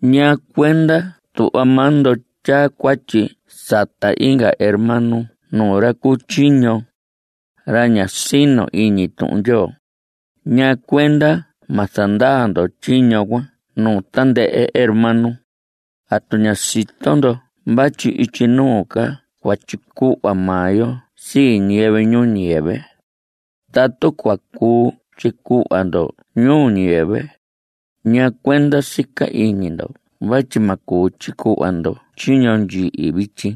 ¿Ñaa cuenda tuhva maa ndo tyaa cuatyi sata inga hermano nuu ra cu tyiño, ra ña sino iñi Tuhun Ndyoo? ¿Ñaa cuenda ma zandaa ndo tyiño cuan nuu tandɨhɨ hermano? ¿Atu ña sito ndo vatyi ityi nuu ca cua tyicuhva maa yo sii ñiyɨvɨ ñuu ñiyɨvɨ? Tatu cua cuu tyicuhva ndo ñuu ñiyɨvɨ, ¿ñaa cuenda sica iñi ndo vatyi ma cuu tyicuhva ndo tyiño ndyihi vityi?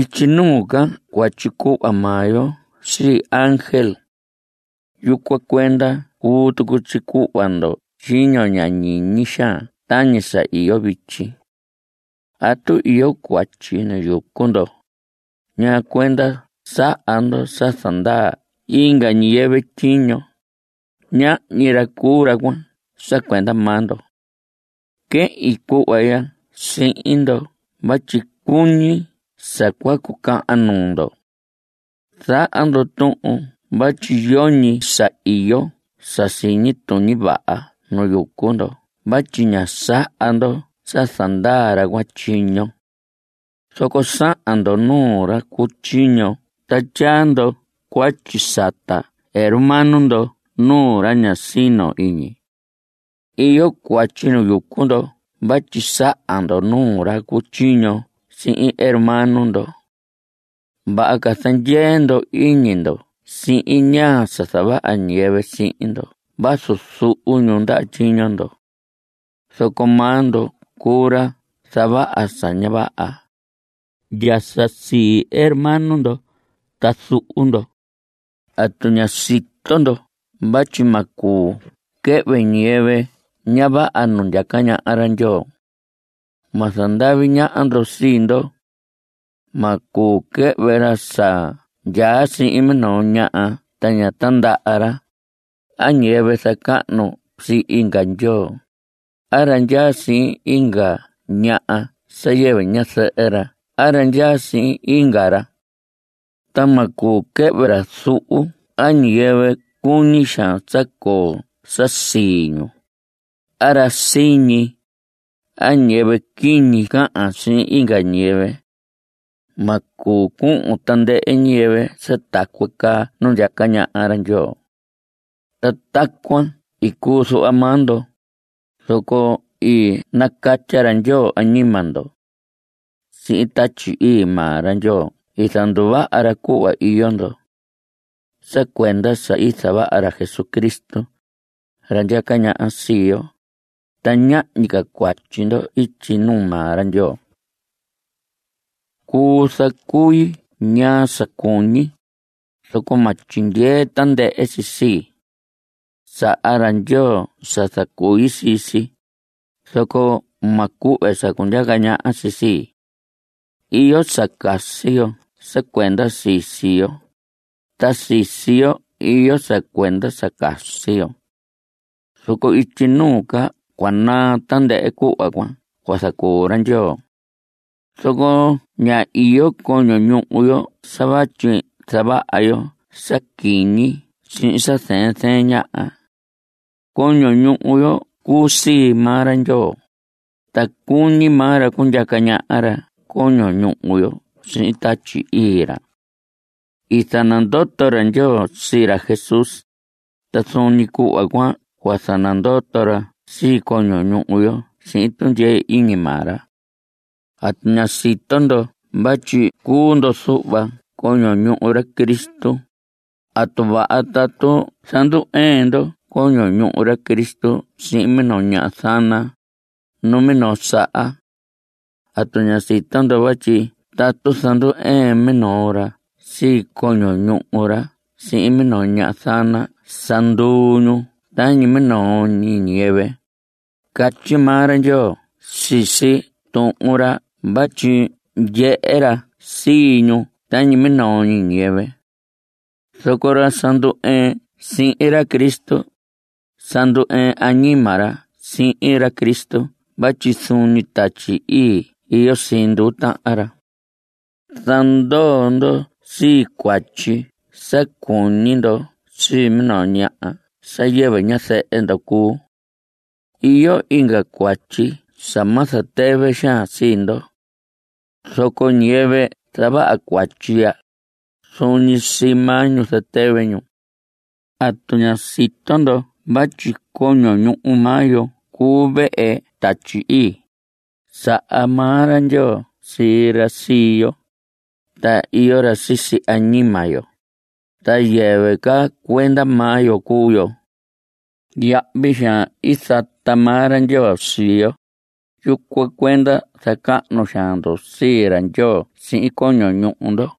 Ityi nuu ca cua tyicuhva maa yo sii ángel. Yucuan cuenda cuu tucu tyicuhva ndo tyiño ña ñiñi xaan tañi sa iyo vityi. Tatu iyo cuatyi nu yucu ndo ¿ñaa cuenda saha ndo sa zandaa inga ñiyɨvɨ tyiño? Ñahñi ra cuu ra cuan sa cuenda maa ndo. Quehin cuhva ya sihin ndo vatyi cuñi sa cua cucahan nuu ndo. Zaha ndo tuhun vatyi yoñi sa iyo sa siñi tuñi vaha nu yucu ndo vatyi ña saha ndo sa zandaa ra cuan tyiño. Zoco sahan ndo nuu ra cu tyiño ta tyaa ndo cuatyi sata hermano ndo nuu ra ña sino iñi. Iyo cuatyi nu yucu ndo vatyi sahan ndo nuu ra cu tyiño sihin hermano ndo. Vaha ca zandyee ndo iñi ndo sihin ñaa sa zavaha ñiyɨvɨ sihin ndo vazu zuhu ñu ndaha tyiño ndo. Zoco maa ndo cuu ra zavaha sa ña vaha. Ndya sa sii hermano ndo ta zuhu ndo. ¿Atu ña sito ndo vatyi ma cuu quɨhvɨ ñiyɨvɨ ña vaha nu ndyaca ñaha ra Ndyoo? Ma zandavi ñaha ndo sii ndo. Ma cuu quɨhvɨ ra sa ndyaa sihin minoo ñaha ta ña tindaha ra, a ñiyɨvɨ zacahnu sii inga ndyoo, a ra ndyaa sihin inga ñaha sa yɨvɨ ñazɨhɨ ra a ra ndyaa sihin inga ra. Ta ma cuu quɨhvɨ ra zuhu a ñiyɨvɨ cuñi xaan sa coo sa sii ñu, a ra siñi, a ñiyɨvɨ quiñi cahan sihin inga ñiyɨvɨ. Ma cuu cuhun tandɨhɨ ñiyɨvɨ sa tacuan caa nu ndyaca ñaha ra Ndyoo. Ta tacuan i cuu zuhva maa ndo. Zoco i nacatya ra Ndyoo añima ndo. Sihin Tatyi Ii maa ra Ndyoo i zanduvaha ra cuhva iyo ndo. Sa cuenda sa i zavaha ra Jesucristo, ra ndyaca ñaha sii yo, ta ñahñi ca cuatyi ndo ityi nuu maa ra Ndyoo. Cuu zacui ñaa sa cuñi, zoco ma tyindyee tandɨhɨ si sii. Saha ra Ndyoo sa zacui sii si, zoco ma cuhve sa cundyaca ñaha si sii. Iyo sa casi yo sa cuenda sisi yo, ta sisi yo iyo sa cuenda sa casi yo. Zoco ityi nuu ca cua naa tandɨhɨ cuhva cuan cua zacuu ra Ndyoo. Zoco ña iyo coño ñuhu yo sa vatyi zavaha yo sa quiñi sihin sa zɨɨn zɨɨn ñaha. Coño ñuhu yo cuu sii maa ra Ndyoo. Ta cuñi maa ra cundyaca ñaha ra coño ñuhu yo sihin Tatyi Ii ra. I zanandoto ra Ndyoo sii ra Jesús, ta zuun ñi cuhva cuan cua zanandoto ra sii coño ñuhu yo sihin tundyee iñi maa ra. ¿Atu ña sito ndo vatyi cuu ndo zuhva coño ñuhu ra Cristo? ¿Atu vaha tatu zandu‑ɨɨn ndo coño ñuhu ra Cristo sihin minoo ñaha zana? ¡Numinoo saha! ¿Atu ña sito ndo vatyi tatu zandu‑ɨɨn minoo ra sii coño ñuhu ra sihin minoo ñaha zana sa nduu ñu tañi minoo ñi ñiyɨvɨ? Catyi maa ra Ndyoo sisi Tuhun ra vatyi ndyehe ra sii ñu tañi minoo ñi ñiyɨvɨ. Zoco ra sa ndu‑ɨɨn sihin ra Cristo, sa ndu‑ɨɨn añima ra sihin ra Cristo vatyi zuun ñi Tatyi Ii iyo sii nduu tahan ra. Zandoo ndo sii cuatyi sa cuñi ndo sii minoo ñaha sa yɨvɨ ñazɨhɨ ndo cuu. Iyo inga cuatyi sa ma zatɨvɨ xaan sii ndo. Zoco ñiyɨvɨ zavaha cuatyi ya, zuun ñi sii maa ñu zatɨvɨ ñu. ¿Atu ña sito ndo vatyi coño ñuhu maa yo cuu vehe Tatyi Ii? Saha maa ra Ndyoo sii ra sii yo, ta iyo ra sisi añima yo. Ta yɨvɨ ca cuenda maa yo cuu yo. Yahvi xaan i zata maa ra Ndyoo sii yo. Yucuan cuenda zacahnu xaan ndo sii ra Ndyoo sihin coño ñuhu ndo.